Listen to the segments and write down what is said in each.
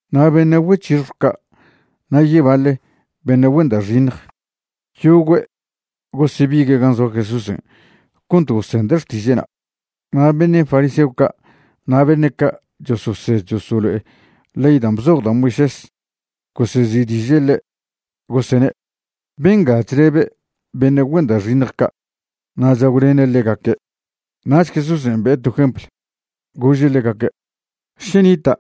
Na' beṉe' güec̱hixjw ca' na' yebaḻe beṉe' güen da' xiṉj, yogüe' gosebigue' gan' zoa Jesúsen' cont gosende' xtiže'na'. Na' beṉe' fariseo ca' na' beṉe' ca' chososed chosolo'e ley dan' bzoj da' Moisés gosezi'diže' ḻe', gosene': ―Benga chlebe' beṉe' güen da' xiṉj ca' na' chagwlene' ḻegaque'. Nach Jesúsen' be'e to jempl, gože' ḻegaque': ―Še nita'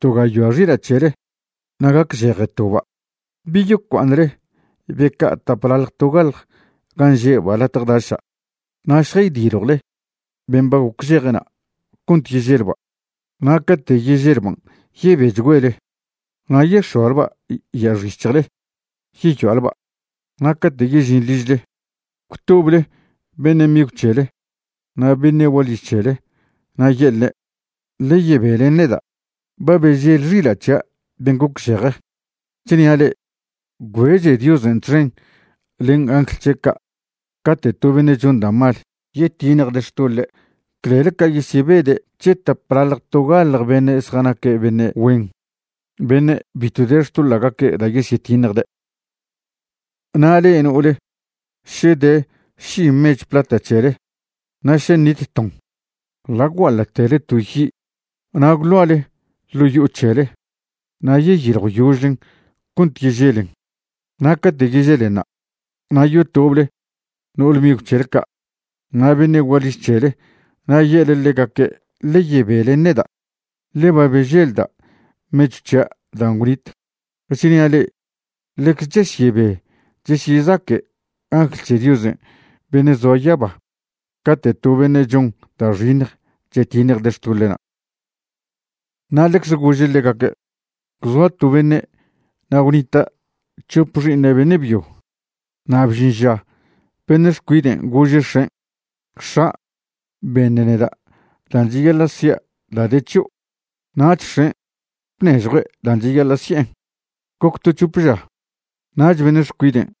to gayoa xila' c̱hele na' gacžeje toba', ¿bi yocua'aṉle be ca' taplaḻj togaḻj gan' že'ba' latje daša' na' šjaydiljwle ben' ba gocžejena' cont yeželba'? Na' cate' yeželban' yebechgüele na' yex̱oalba' ya'axic̱hjle yeyoa'lba'. Na' cate' yežin ližle, gwtoble beṉe' migw c̱hele na' beṉe' gualiž c̱hele na' ye'lne': “Ḻe yebe len neda'. Ba bežel xila' c̱hia' ben' gocžeje.” Chnia' le'e, gwbeche Diosen' txen len angl c̱he' ca' cate' to beṉe' chon da' mal yetiṉjde' xtoḻe' clel ca yesyebede' c̱he tapḻaḻj togaḻj beṉe' zjanaque' beṉe' güen beṉe' bitw de xtoḻa'gaque' da' yesyetiṉjde'. ’Na' le'e no'ole še de ši mechw plata c̱hele na' še ṉit ton, ḻa' gwguaḻa'tele to yi' na' gwḻoale ḻo' yo'o c̱hele na' yeyiljwyožlen cont yeželen. Na' cate' yeželenṉa', na' yotoble no'ole migw c̱hele ca' na' beṉe' gualiž c̱hele na' ye'le ḻegaque': “Ḻe yebe len neda', ḻe ba beželda' mechw c̱hia' dan' gwnit.” Chnia' le'e ḻecze chesyebe chesyezaque' angl c̱he Diosen' beṉe' zoa yaba cate' to beṉe' chon da' xiṉj chetiṉjde' xtoḻe'na'. Na' ḻecze gože' ḻegaque': ―Gwzoa to beṉe' na' gwnita' c̱hop xi'iṉe' beṉe' byo. Na' bžin ža beṉe' xcuiden' gože' x̱en': “X̱a', beṉ neda' dan' cheyaḻa' sia' da' de c̱hio'.” Nach x̱en' bnežjue' dan' cheyaḻa' si'en. Goc to c̱hop ža nach beṉe' xcuiden'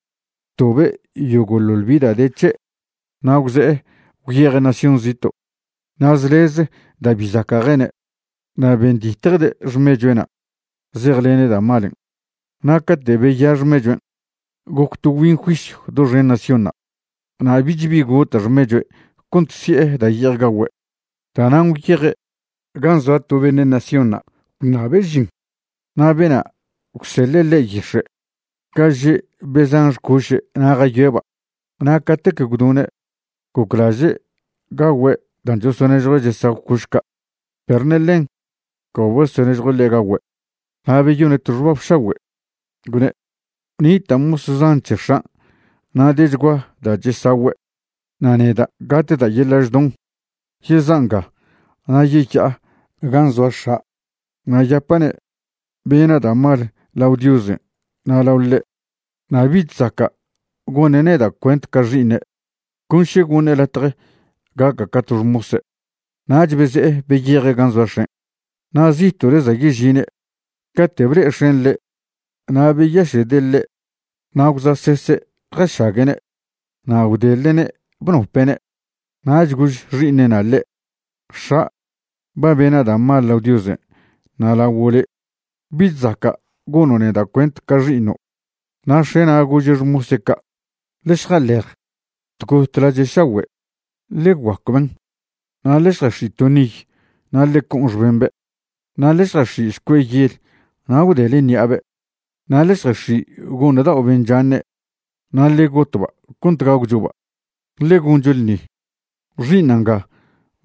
btobe' yogo'ḻoḻ bi da' de c̱he' na' gwze'e gwyeje' nación zito' na' zlez da' bi zaca' jene'. Na' benditjde' xmechue'na' zejlene' da' malen'. Na' cate' beya xmechuen', goc to gwbin juisyw doxen naciónṉa', na' bich bi gota' xmechue' cont si'e da' ye'ej gagüe'. Da'nan' gwyeje' gan' zoa to beṉe' naciónṉa' gwṉabe' žin, na' bena' gwseḻe' ḻe' yix̱e' ga že' be zan xcoše' na' jayoe'ba'. Na' catec gwdone' goclaže' gagüe' dan' chosonežjue' chesagw coš ca', perw ṉe ḻen ca bosonežjue' ḻe' gagüe'. Na' beyone' to xbab šagüe', gwne': “Nita' mos zan c̱he x̱an' na' dechgua da' chesagüe', na' neda' gatda' yeḻa' chdon. Yeza' nga na' yeya'a gan' zoa x̱a' na' yapa'ne' bena' da' mal lao Diosen' na' lao ḻe', na' bich zaca' gone' neda' cuent ca xi'iṉe', con še goṉe' latje gaca' ca to xmose'.” Nach beze'e beyeje' gan' zoa x̱en'. Na' zito'le za' yežine' cate' ble'e x̱en' ḻe' na' beyaše'de' ḻe' na' gwza'sese' jašague'ne'. Na' gwdeḻe'ne' bnope'ne'. Nach gož xi'iṉe'na' ḻe': “X̱a', ba bena' da' mal lao Diosen' na' laguo' le'. Bich zaca' gono' neda' cuent ca xi'iṉo'.” Na' x̱e'na' gože' xmose' ca': “Ḻe šjaḻej tgot lache' šagüe', ḻe guacwben', na' ḻe šjax̱i' to niy na' ḻe co'on xbembe', na' ḻe šjax̱i' šcue' yel na' gwdelen ṉi'abe'. Na' ḻe šjax̱i' go'ṉ dao' ben' chaṉe' na' ḻe gotba' cont gagwchoba', ḻe goncho ḻṉi. Xi'iṉa' nga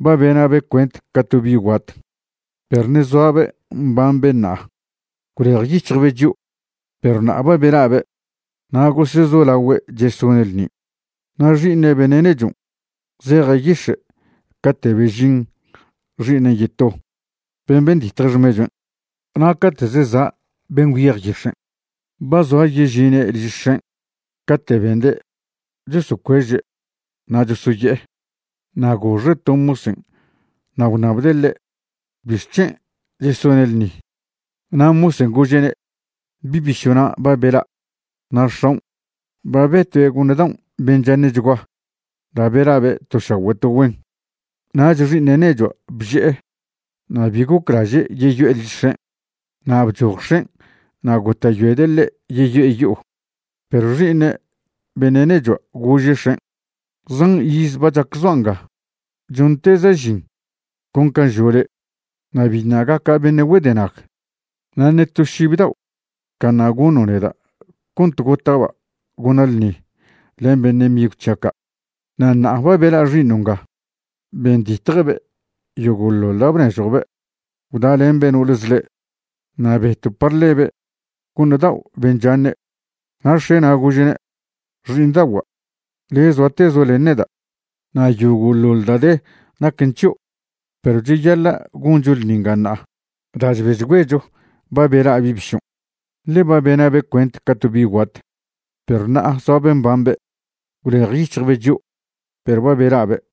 ba bena'be' cuent ca to bi' guat, perw ṉe' zoabe' mbambe' ṉa'a. Gwlejyic̱hjbe' chio', perw ṉa'a ba bela'be'.” Na' gosezolaogüe' chesone' ḻṉi. ’Na' xi'iṉe' beṉe' nechon' zeje' yix̱e' cate' bežin xi'iṉen' yeto ben' benditje xmechuen', na' cate' zeza' ben' gwyej yix̱en', ba zoa yežine' liž x̱en' cate' bende' chosocueže' na' chosoye'e. Na' goxe' to mosen' na' gwṉabde' ḻe' bixc̱hen' chesone' ḻṉi. Na' mosen' gože'ne': “Bi' bišo'na' ba bela' na' x̱aon' ba betue' go'ṉ daon' ben' chaṉe'chgua da' bela'be' to šagüe' to güen.” Nach xi'iṉe' nechua' bže'e na' bi goclaže' yeyo'e liž x̱en'. Na' bchoj x̱en' na' gota'yoede' ḻe' yeyo'e yo'o. Perw xi'iṉe' beṉe' nechua' gože' x̱en': “Zan iz ba chac zoa' nga chonteza' žin con can' žo' le', na' biṉa' gaca' beṉe' güedenag. Na' ṉe to šib dao' caṉa' goṉo' neda' cont gota'ba' gona' ḻṉi len beṉe' migw c̱hia' ca'. Na' ṉa'a ba bela' xi'iṉo' nga benditjbe' yogo'ḻoḻ da' bnežjo'be' gwdalembe' no'ole zḻe', na' beto' par ḻebe' go'ṉ dao' ben' chaṉe'.” Na' x̱e'na' gože'ne': “Xi'iṉdagua', le' zoatezo' len neda', na' yogo'ḻoḻ da' de naquen c̱hio'. Perw cheyaḻa' goncho ḻṉi nga ṉa'a da' chbechgüecho ba bela' bi' bišon', ḻe ba bena'be' cuent ca to bi' guat, perw ṉa'a zoabe' mbambe'; gwlejyic̱hjbe' chio', perw ba bela'be'.”